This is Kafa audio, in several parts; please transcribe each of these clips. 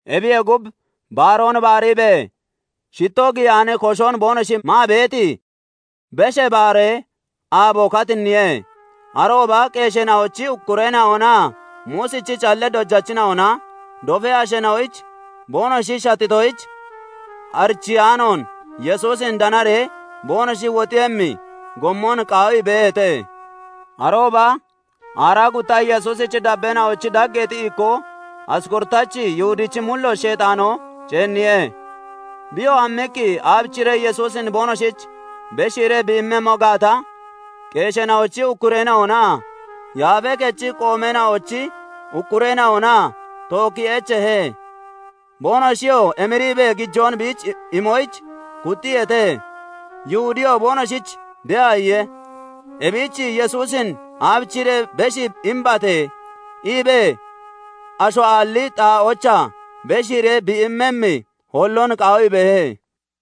Ebiyee gub, baaroon baariibee shittoo giyaani koshon boonoshi maa beeti, Beshee Baaree aabo katinniye. Arooba qeesheena'ochi ukkureena'onaa Muusichi callee dojachina'ona dofee asheena'oyich boonoshi shattitoyich, arichiyaanoon Yesuusin danaree boonoshi wuxiiyemmi gommon qaawii beeheete. Arooba aaraa gutta Yesuusichi dabbeena'ochi dageexi ikkoo Asqorotachi Yihudichi mullooch Sheexaanoo ceenniye. Biyoo hammiqqi aabichiree Yesuusin boonoshich beshiiree bi immemmo gaata, qeesheena'ochi ukkureena'onaa Yaafee Kechi qoomeena'ochi ukkureena'ona tookkii echeehe. Boonoshiyoo emiriibee gijoon biich imoyich kuxxiyeete. Yihudiyoo boonoshich de'a iye. Ebich "Yesuusin aabichiree beshii imbate? iibee asho aalli xaa'oochaa beshiiree bi immemmi holloon qaawii beehe.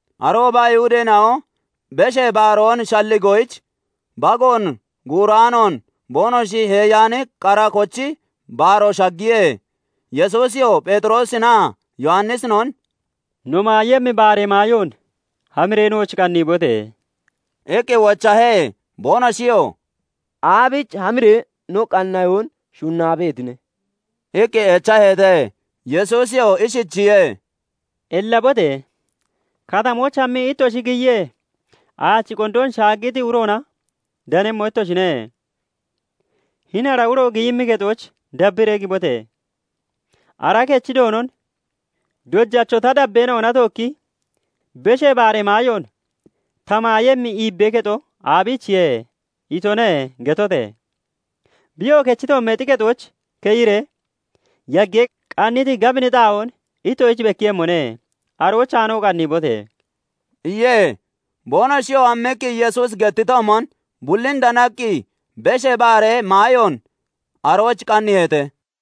Arooba Ayihudeena'o Beshee Baaroon shalligoyich, bagoon guuraanoon boonoshi heeyaani qara kochi baaroo shaggiye. Yesuusiyoo Pheexiroosinaa Yowannisinon " no maayemmi baaree maayoon hamiree nooch qanniibote!" iqqi wochahe. Boonoshiyoo "Aabichi hamiree no qanniyoon shunnaa beetine?" iqqi echaheete. Yesuusiyoo ishichiye:- "Ellabote! Katamooch hammii ittoshi giyiyee, aachi qondoon shaaggiti uroona danemmo ittoshine; hini ara uro giyimmi kexooch dabbiree gibote! Ara kechi doonon 'Dojacho "Ta dabbeena'ona tookki Beshee Baaree maayoon ta maayemmi iibbee kexo aabichiye?" itone' getote! Biyoo kechi toommeexi kexooch keyiree yaggee qanniti gabini xaa'oon ittoshich bekkiiyemmone; aroochaanoo qanniibote!" iye. Boonoshiyoo hammiqqi Yesuusi gettitoomon bullin danaqqi Beshee Baaree maayoon arooch qanniiheete.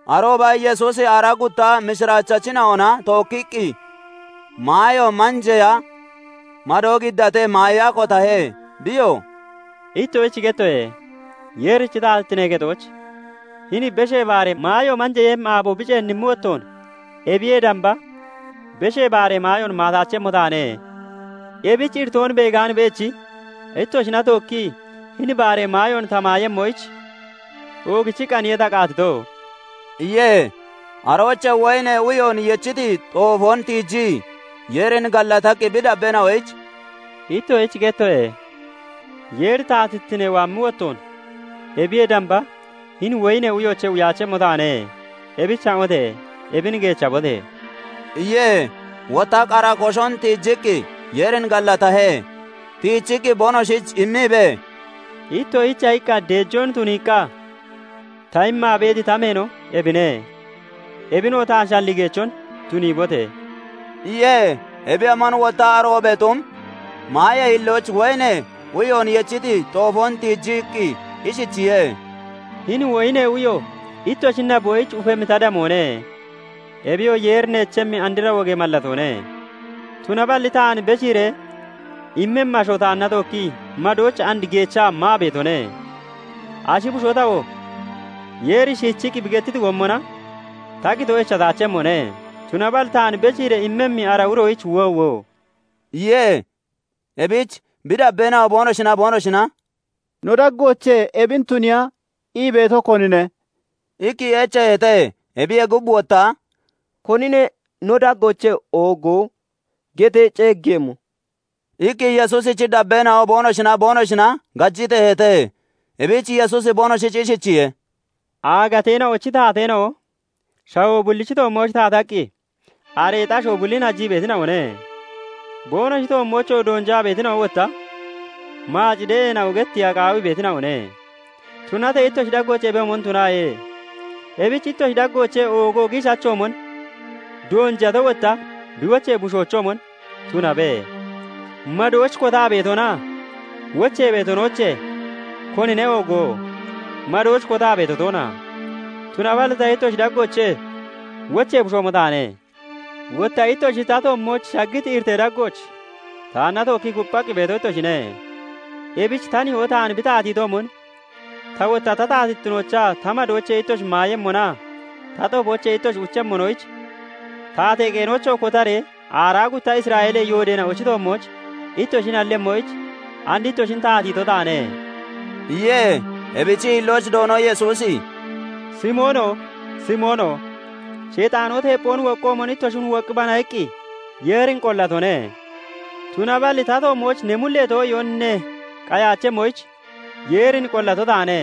Arooba Yesuusi aaraa gutta mishiraachachina'ona tookkiqqi maayo manjeeya madoo giddatee maaya kotahe. Biyoo "Ittoshich gettoye; Yeerichi taatittinee kexooch hini Beshee Baaree maayo manjeeyemmi aabo bi ceennimmi wottoon ebiyee damba Beshee Baaree maayoon maataachemmo taane; ebich iritoon beegaan beechi ittoshina tookkii hini baaree maayoon ta maayemmoyich oogichiqqaaniye ta qaatito" iye. Aroochee woyinee uyoon yechiti xoofoon tiijii Yeerin gallataqqi bi dabbeena'oyich "Ittoshich gettoye; Yeeri taatittine waammi wottoon ebiyee damba hini woyinee uyoochee uyaachemmo taane. Ebich ha'ote! Ebin geechabote!" iye. Wotta qara koshon tiijiqqi Yeerin gallatahe; tiichiqqi boonoshich immiibee, "[ittoshicha iqqa deejoon tuniiqqa ta immaa beeti] ta meeno ebine ebinoo taan shalligeechon tuniibote!]" iye. [Ebiyoomon wotta aroobee xum maayee hillooch woyinee uyoon yechiti xoofoon tiijiqqi ishichiye:- "Hini woyinee uyo ittoshi naboyich ufemmi ta damoone; ebiyoo Yeeri neechemmi andra wogee mallatoone.] Tunaballi taan beshiiree immemmi asho taanna tookkii madooch and geechaa maa beetone. Ashi bushoo tawoo Yeeri shiichiqqi bi gettiti gommona ta qitoo echataachemmone; tunaballi taan beshiiree immemmi ara uroyich woowo!" iye. Ebich bi dabbeena'o boonoshinaa boonoshina "No daggoochee ebin tuniiya ii beeto konine?" iqqi echeeheete. Ebiyee gub, wotta "Konine no daggoochee oogo getee ceeggeeyemmo?" iqqi Yesuusichi dabbeena'o boonoshinaa boonoshina gajiteeheete. Ebich Yesuusi boonoshich ishichiye:- "Aagateena'ochi taateena'o shawoo bullichi toommooch taataqqi areexi asho bullin hajii beetina'one; boonoshi toommooch doonjaa beetina'o wotta 'Maac de'eena'o' getteeya qaawii beetina'one. Tunatee ittoshi daggooch ebiyoomon tunaaye! Ebich ittoshi daggoochee oogo giishachoomon, doonjato wotta bi wochee bushoochoomon tunabe! Madooch kotaa beetonaa wochee beetonoochee konine oogo? Madooch kotaa beeto toona? Tunaballi ta ittoshi daggoochee wochee bushoomo taane. "Wotta ittoshi ta toommooch shaggiti iritee daggooch taanna tookkii kupphaqqi beeto ittoshine. Ebich ta nihoo taan bi taatiitoomon, ta wotta ta taatittinoochaa ta madoochee ittoshi maayemmonaa ta xoofoochee ittoshi uchemmonoyich, taatee qeenoochoo kotaree aaraa gutta Isra'eelee yoodeena'ochi toommooch ittoshi nallemmoyich and ittoshin taatiito taane" iye. Ebichi hillooch Doono Yesuusi "Simoono! Simoono! Sheexaanoo teepphoon woqqoomon ittoshin 'Woqqibana' iqqi Yeerin qollatone; Tunaballi ta toommooch ne mullee too'iyoon ne qayaachemmoyich Yeerin qollato taane;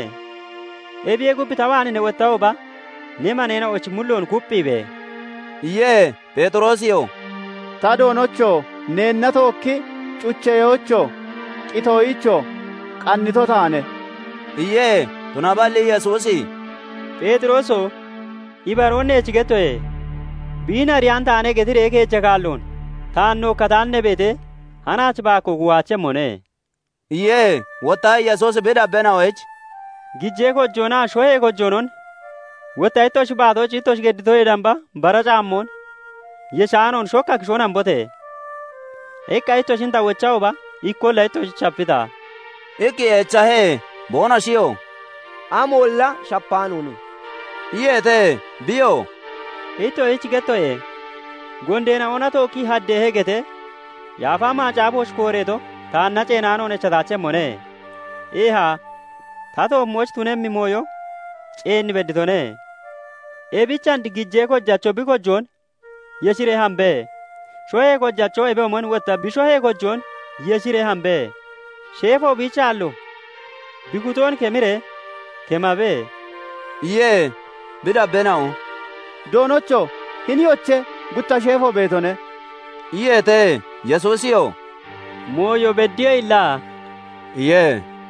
ebiyee gub ta waan ne wottahooba ne maneena'ochi mulloon kupphiibe!" iye. Pheexiroosiyoo "Ta Doonocho! Neenna tookki cucheyoyichoo, qitoyichoo qannito taane" iye. Tunaballi Yesuusi "Pheexirooso! Ibaroon eech gettoye! 'Biin ariyaan taane' getiree keeja kaalloon taan nookkataan ne beetee, hanaach baakkoo kuuhaachemmone" iye. Wotta Yesuusi bi dabbeena'oyich " 'Gijee kojoonaa shohee kojoonon, wotta ittoshi baatooch ittoshi gedditoyee damba bara caammoon yeshaanoon shokka kishoon hambote!' iqqa ittoshin ta wochahooba ikkolla ittoshich shapita?" iqqi echahe. Boonoshiyoo "Amolla shapaanoone" iyeete. Biyoo "Ittoshich gettoye; 'Gondeena'ona tookkii haddeehe' getee Yaafa Macaafooch kooreeto taanna ceenaanoon echataachemmone; eeha, ta toommooch tunemmi mooyo ceen bedditone. Ebich and gijee kojacho bi kojoon yeshiree hambe! Shohee kojachoo ebiyoomon wotta bi shohee kojoon yeshiree hambe! Sheefo biichi aallo bi kutoon kemiree kemabe!" iye. Bi dabbeena'o "Doonocho! Hiniyoche, gutta sheefo beetone" iyeete. Yesuusiyoo "Mooyo beddiye illa" iye.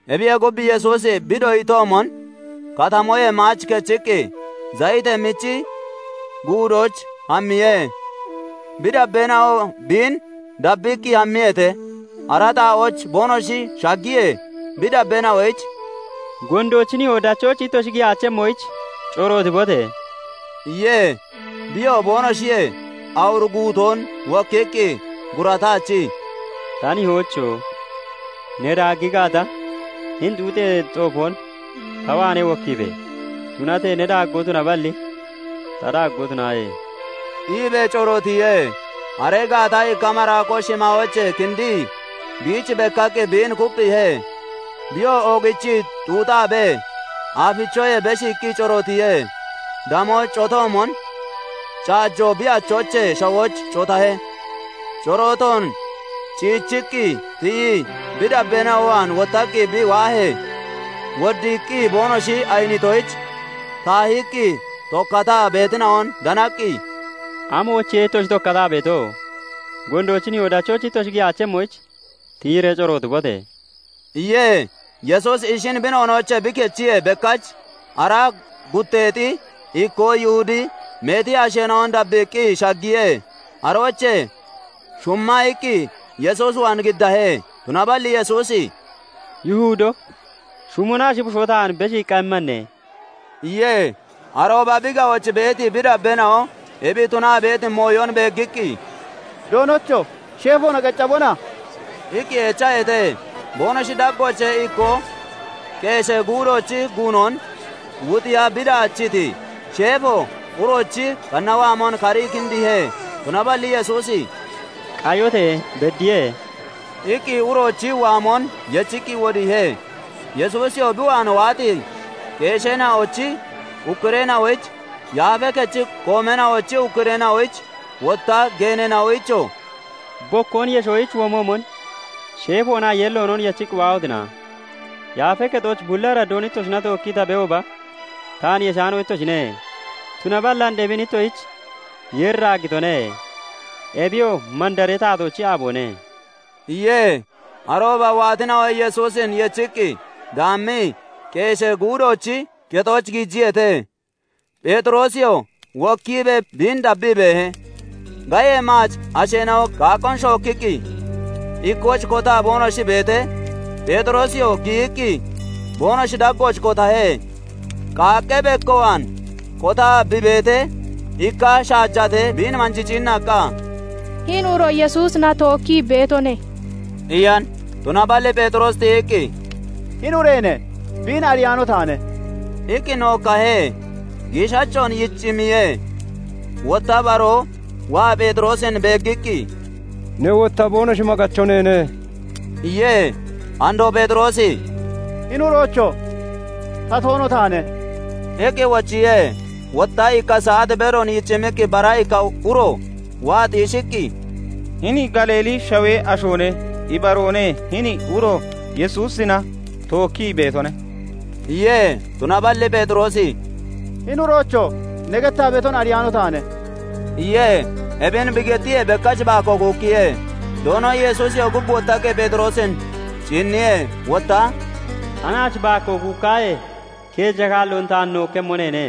Ebiyee gub, Yesuusi bi doyitoomon katamoyee maach kechiqqi Zayitee Michi Guudooch hammiye; bi dabbeena'oo biin dabbiqqi hammiyeete. Ara xaa'ooch boonoshi shaggiyee, bi dabbeena'oyich "Gondoochi nihoo dachooch ittoshi giyaachemmoyich corootibote!" iye. Biyoo boonoshiyee awur guutoon (bedoon) wokkiqqi gurataachii, "Ta nihoocho! Ne daaggi gaata, hini xuuxee xoofoon (xuyoon) ta waanee wokkiibe! Tunatee ne daaggoo tunaballi, ta daaggoo tunaaye!" iibee corootiye. Aree gaata ikka maraakoo shimaayoochee kindii biich bekkaqqi biin kupphiihe. Biyoo oogichii xuuxaabee aafichoyee beshiiqqi corootiye; damoo cotoomon caajo bi achoochee shawooch cotahe. Corootoon ciichiqqi tiyii bi dabbeena'o waan wottaqqi bi waahee, woddiiqqi boonoshi ayinitoyich taahiqqi tokkataa beetina'on danaqqi, "Amoyichiye ittoshi tokkataa beeto? Gondoochi nihoo dachooch ittoshi giyaachemmoyich tiyiree corootibote!" iye. Yesuusi ishin bi noonoochee bi kichiyee, bekkach aaraa gutteexi ikkoo Yihudi meeti asheena'on dabbiiqqi shaggiye; aroochee shumma iqqi Yesuus waan giddahe. Tunaballi Yesuusi "Yihudo! Shumona ashi bushoo taan beshiiqqa immane?" iye. Arooba bi ga'ooch beeti bi dabbeena'o ebi tunaa beeti mooyon beeggiqqi, "Doonocho! Sheefoona qeccabona?" iqqi echaheete. Boonoshi daggoochee ikkoo qeeshee guudoochi guunon wuxiya bi daachiiti sheefo uroochi qanna waamon karii kindiihe. Tunaballi Yesuusi "Qayote! Beddiye!" iqqi uroochi waamon yechiqqi wodiihe. Yesuusiyoo bi waan waati qeesheena'ochi ukkureena'oyich, Yaafee Kechi qoomeena'ochi ukkureena'oyich, wotta geeneena'oyichoo "Bokkoon yeshoyich womoomon sheefoonaa yeelloonon yechiqqi waahotina? Yaafee Kexooch bulli araddoon ittoshina tookkii ta beehooba taan yeshaano ittoshine; tunaballi and ebin ittoshich Yeeri daaggitone; ebiyoo mandaree taatoochi aaboone" iye. Arooba waatina'o Yesuusin yechiqqi daammii, qeeshee guudoochi kexooch giijiyeete; Pheexiroosiyoo wokkiibee biin dabbii beehe. Gayee maac asheena'o qaaqqoon shookkiqqi ikkooch kotaa boonoshi beetee, Pheexiroosiyoo giyiqqi boonoshi daggooch kotahe. Qaaqqee bekko waan kotaa bi beetee, ikka shaajatee biin manjii ciinnaqqa, "Hini uro Yesuusina tookkii beetone" iyan. Tunaballi Pheexiroosi tiyiqqi, "Hini ureene! Biin ariyaano taane" iqqi nookkahe. Giishachoon yicimmiyee, wotta baroo waa Pheexiroosin beeggiqqi, "Ne wotta boonoshi maggacho neene" iye. Andoo Pheexiroosi "Hini uroocho! Ta toono taane" iqqi wochiye. Wotta ikka saat bedoon yicimmiqqi bara ikka uro waa xiishiqqi, "Hini Galiilee shawee ashoone! Ibaroone; hini uro Yesuusina tookkii beetone" iye. Tunaballi Pheexiroosi "Hini uroocho! Ne gettaa beeton ariyaano taane" iye. Ebin bi gettiyee, bekkach baakkoo kuukkiye. Doono Yesuusiyoo gub wottaqqi Pheexiroosin ciinniye; Wotta "Hanaach baakkoo kuukkaahee, keeja kaalloon taan nookkemmo neene"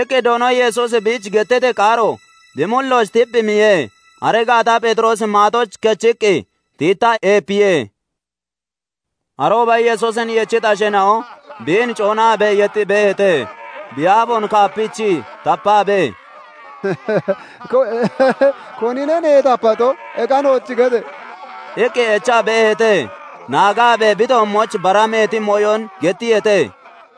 iqqi Doono Yesuusi biich gettiti qaaro bi mullooch tiphimmiye. Aree gaata Pheexiroosi maaxooch kechiqqi tiittaa eepiye. Arooba Yesuusin yechiti asheena'o biin coonaabee yexxii beeheete; Bi aafoon kaapichii tapaabee, "Konine neen tapato? Eke nooch gete!" iqqi echa beeheete. Naagaabee bi toommooch bara meeti mooyon gettiyeete.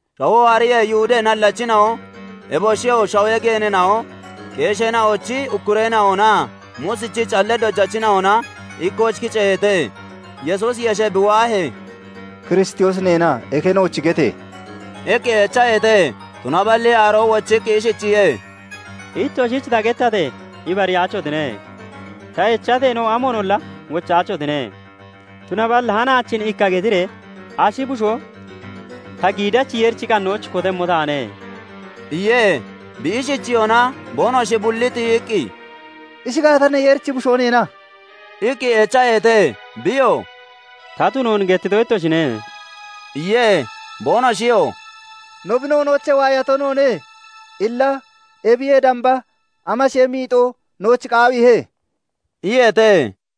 Shawoo hariyee, Ayihudee nallachina'o, eboshiyoo shawee geeneena'o, qeesheena'ochi ukkureena'onaa Muusichi callee dojachina'ona ikkooch kiceeheete. Yesuusi yeshee bi waahee, "Kiristoosi neena? Eke nooch gete!" iqqi echaheete. Tunaballi aroo wochiqqi ishichiye:- "Ittoshich ta gettatee, ibariyaachotine; Ta echateenoo, amoonolla wochaachotine. Tunaballi hanaachin ikka getiree ashi bushoo ta giidachi Yeerichi qannooch kotemmo taane" iye. Bi ishichiyona boonoshi bulli tiyiqqi, "Ishi gaata, ne Yeerichi Bushoo neena?" iqqi echaheete. Biyoo "Ta tunoon gettito ittoshine" iye. Boonoshiyoo "No bi noonoochee waayato noone; illa ebiyee damba amashee miixoo nooch qaawiihe?" iyeete.